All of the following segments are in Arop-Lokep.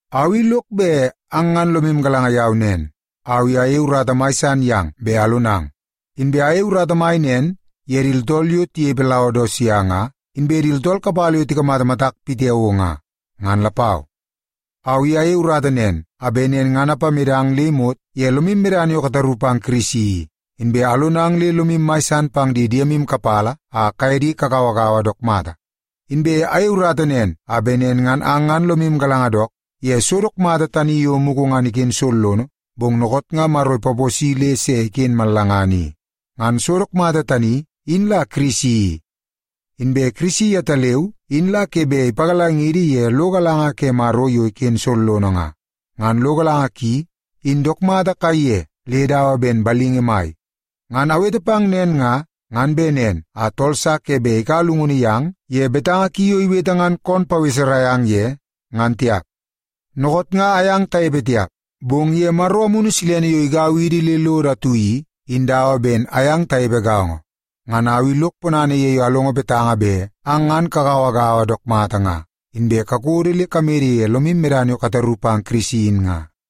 Au i lok bet ang ngan lomu galanga yau nen, au i ayei urata mai san yang bet alonang. Inbe ayei urata mai nen ye di tooltool yo tinepe Laodisia nga, inbe di tooltool kapala yo tikamata matak pitiao nga, ngan lapau. Au i ayei urata nen a bet nen ngan apamedang le imot ye lomu medana yo kataru pang Kirisi i, inbe alonang le lomu mai san pang di diemu kapala a kaye di kagauagaua dook mata. Inbe ayei urata nen a bet nen ngan ang ngan lomu galanga dook ye so dook mata tani yo mugu ngan iken sollono, bong dookoot nga Maro ipaposi le se iken mallangana i. Ngan so dook mata tani, in la Kirisi i. Inbe Kirisi yetaleu in la ke bet ipagalangidi ye lo galanga ke Maro yo iken sollono nga. Ngan lo galanga ki, in dook mata kaiye le dawa ben balingi mai. Ngan awete pang nen nga, ngan bet nen a tool sa ke bet ikaua llungunu yang ye betanga ki yo iwete ngan kon paweserai ang ye, ngan tiap. Dookoot nga ayang tanepe tiap, bong ye Maro Amunu Silene yo igau idi le lodo atu i, in dawa ben ayang tanepe gaongo. Ngan au i lok ponana ye yo alongo betanga bet ang ngan kagauagaua dook mata, inbe kakodo le kamede ye lomu medana yo kataru pang Kirisi in nga.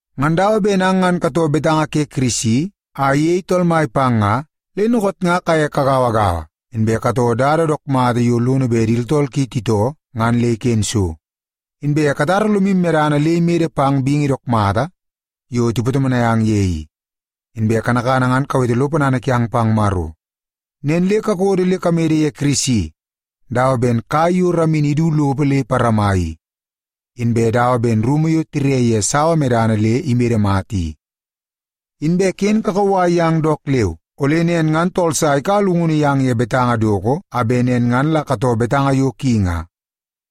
Ngan dawa ben ang ngan katoo betanga ke Kirisi a iyei Tool Mai pang nga, le dookoot nga kaye kagauagaua, inbe katoo dada dook mata yo lono bet di tooltool ki titoo ngan le iken so. Inbe katara lomu medana le imede pang bingi dook mata yo tipatomonai ang ye i, inbe kanakana ngan kawete lo ponana kiang pang Maro. Nen le kakodo le kamede ye Kirisi dawa ben kai yo ramini idu lopo le iparama i, inbe dawa ben rumu yo tire ye sawa medana le imede mata i. Inbe ken kakauwai yang dook leu, ole nen ngan tool sa ikaua llungunu yang ye betanga doko a bet nen ngan la katoo betanga yo ki nga.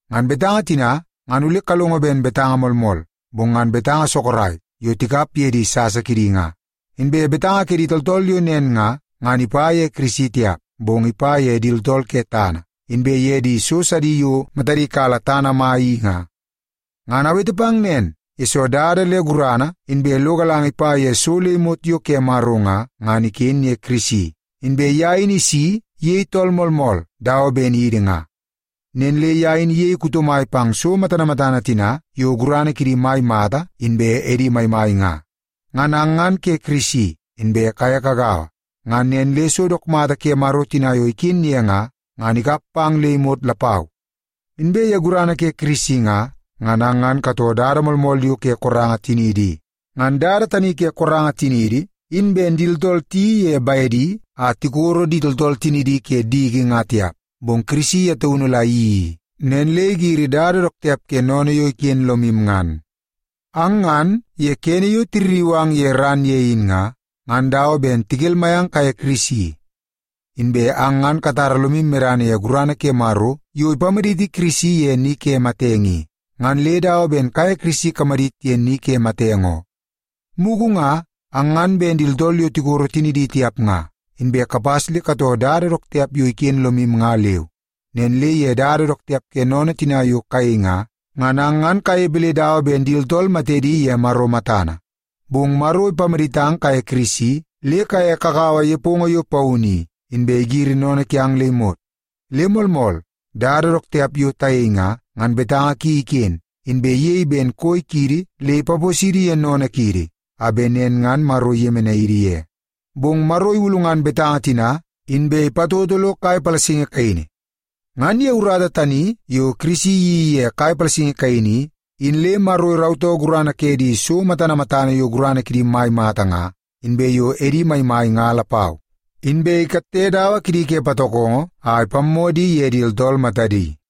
Ngan betanga tina ngan ole kalongo ben betanga moolmool, bong ngan betanga sorok yo tikap ye di sasa kidi nga. Inbe betanga ke di tooltool yo nen nga, ngan ipa ye Kirisi tiap, bong ipa ye di tooltool ke tana, inbe ye di so sidi yo matadi kala tana mai i nga. Ngan awete pang nen, yesoo dada le gurana inbe lo galanga ipa ye so le imot yo ke Maro nga, ngan iken ye Kirisi, inbe ye in isi iyei tool moolmool dawa ben idi nga. Nen le ye in iyei kuto mai pang so matana matana tina yo gurana kidi mai mata inbe edi maimai nga. Ngan ang ngan ke Kirisi, inbe kaye kagaua. Ngan nen le so dook mata ke Maro tina yo iken ye nga, ngan ikap pang le imot lapau. Inbe ye gurana ke Kirisi nga, ngan ang ngan katoo dada moolmool yo ke koranga tiniidi i. Ngan dada tani ke koranga tiniidi in ben di tooltool tiyeii ye bedi a tikoro di tooltool tinidi ke diki nga tiap, bong Kirisi ye taunu la iyeii i, nen le igiri dada dook tiap ke sennene yo iken lomu ngan. Ang ngan ye kene yo tirriu ang ye ran ye in nga, ngan dawa ben tikelmai ang kaye Kirisi. Inbe ang ngan katara lomu medana ye gurana ke Maro yo ipamaditi Kirisi ye ni ke matenge i, ngan le dawa ben kaye Kirisi kamadit ye ni ke matenge oo. Mugu nga, ang ngan ben di tooltool yo tikoro tinidi tiap nga, inbe kapas le katoo dada dook tiap yo iken lomu nga leu. Nen le ye dada dook tiap ke sennene tina yo kayei nga, ngan ang ngan kanepe le dawa ben di tooltool matedi ye Maro matana. Bong Maro ipamaditang kaye Kirisi le kaye kakaua nepongo yo paunu i, inbe igiri sennene kiang le imot. Le moolmool, dada dook tiap yo tayei nga, ngan betanga ki iken, inbe iyei ben koi kiidi le ipaposidi ye sennene kiidi, a bet nen ngan Maro iyemenai idi ye. Bong Maro ilulngan betanga tina, inbe ipatoto lo kai palasingi kaini. Ngan ye urata tani yo Kirisi iyeii ye kai palasingi kaini i, in le Maro irautoo gurana ke di so matana matana yo gurana kidi mai mata nga, inbe yo edi maimai nga lapau. Inbe ikatte dawa kidi ke patokongo a ipammoo di ye di tooltool matadi.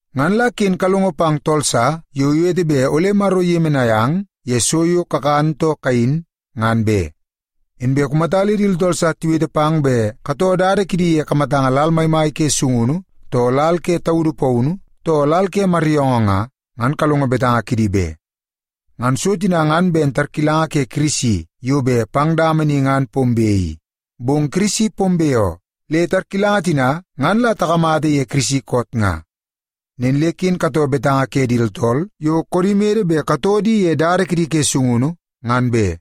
Ngan la ken kalongo pang tool sa yo iwete bet ole Maro iyemenai ang ye so yo kakan too kayin, ngan be. Inbe kumata le di tooltool sa tiwete pang bet katoo dada kidi ye kamatanga lal maimai ke sungunu, too lal ke taudu paunu, too lal ke maryoongoo nga, ngan kalongo betanga kidi be. Ngan so tina ngan ben tarkilanga ke Kirisi yo bet pang dama ni ngan pombe i. Bong Kirisi pombe oo, le tarkilanga tina ngan la takamata ye Kirisi koot nga. Nen le ken katoo betanga ke di tooltool yo koodi mede bet katoo di ye dada kidi ke sungunu, ngan be.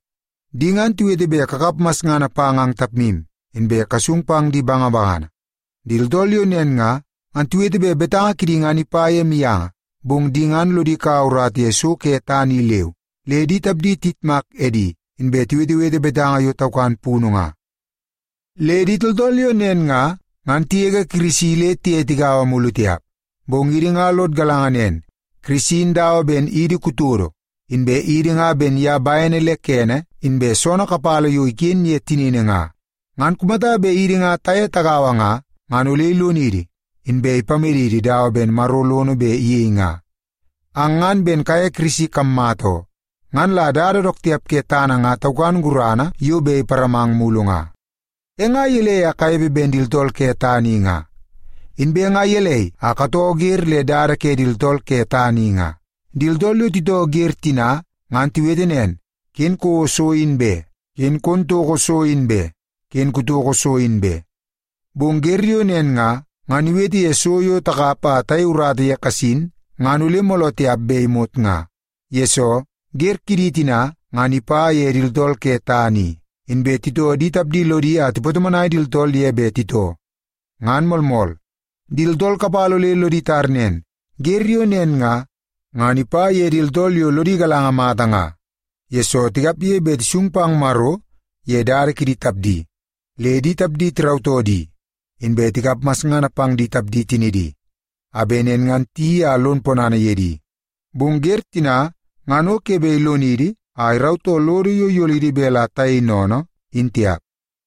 Di ngan tiwete bet kakap masngana pang ang tapmu, inbe kasung pang di bangabangana. Di tooltool yo nen nga, ngan tiwete bet betanga kidi ngan ipa ye mianga, bong di ngan lodi kaua urata ye so ke tana i leu, le di tapdi tiyitmak edi, inbe tiwetewete betanga yo taukan punu nga. Le di tooltool yo nen nga, ngan tigege Kirisi le tiye tigaua mulu tiap. Bong idi nga lod galanga nen, Kirisi in dawa ben idi kutodo, inbe idi nga ben ye bene le kene inbe soonoo kapala yo iken ye tinini nga. Ngan kumata bet idi nga taye tagaua nga, ngan ole ilonidi, inbe ipamedidi dawa ben Maro lono bet iyei nga. Ang ngan ben kaye Kirisi kammata oo. Ngan la dada dook tiap ke tana nga taukan gurana yo bet iparamang mulu nga. E nga gelei a kanepe ben di tooltool ke tana i nga? Inbe nga gelei a katoo wer le dada ke di tooltool ke tana i nga? Di tooltool yo titoo wer tina, ngan tiwete nen, “Ken kouo so in be! Ken kon toko so in be! Ken kutoko so in be!” Bong wer yo nen nga, ngan iwete ye so yo takap a tayei urata ye kasin, ngan ole mooloo tiap be imot nga. Yesoo, wer kidi tina, ngan ipa ye di tooltool ke tana i, inbe titoo di tapdi lodi a tipatomonai di tooltool ye bet titoo. Ngan moolmool, di tooltool kapala ole lodi tar nen, wer yo nen nga, ngan ipa ye di tooltool yo lodi galanga mata nga, yesoo tikapge bet tisung pang Maro ye dada kidi tapdi, le di tapdi tirautoo di, inbe tikap masngana pang di tapdi tinidi, a bet nen ngan tiyeii a lon ponana ye di. Bong wer tina ngan o ke bet ilonidi a irautoo lodo yo iyolidi bet la tayei sennene in tiap.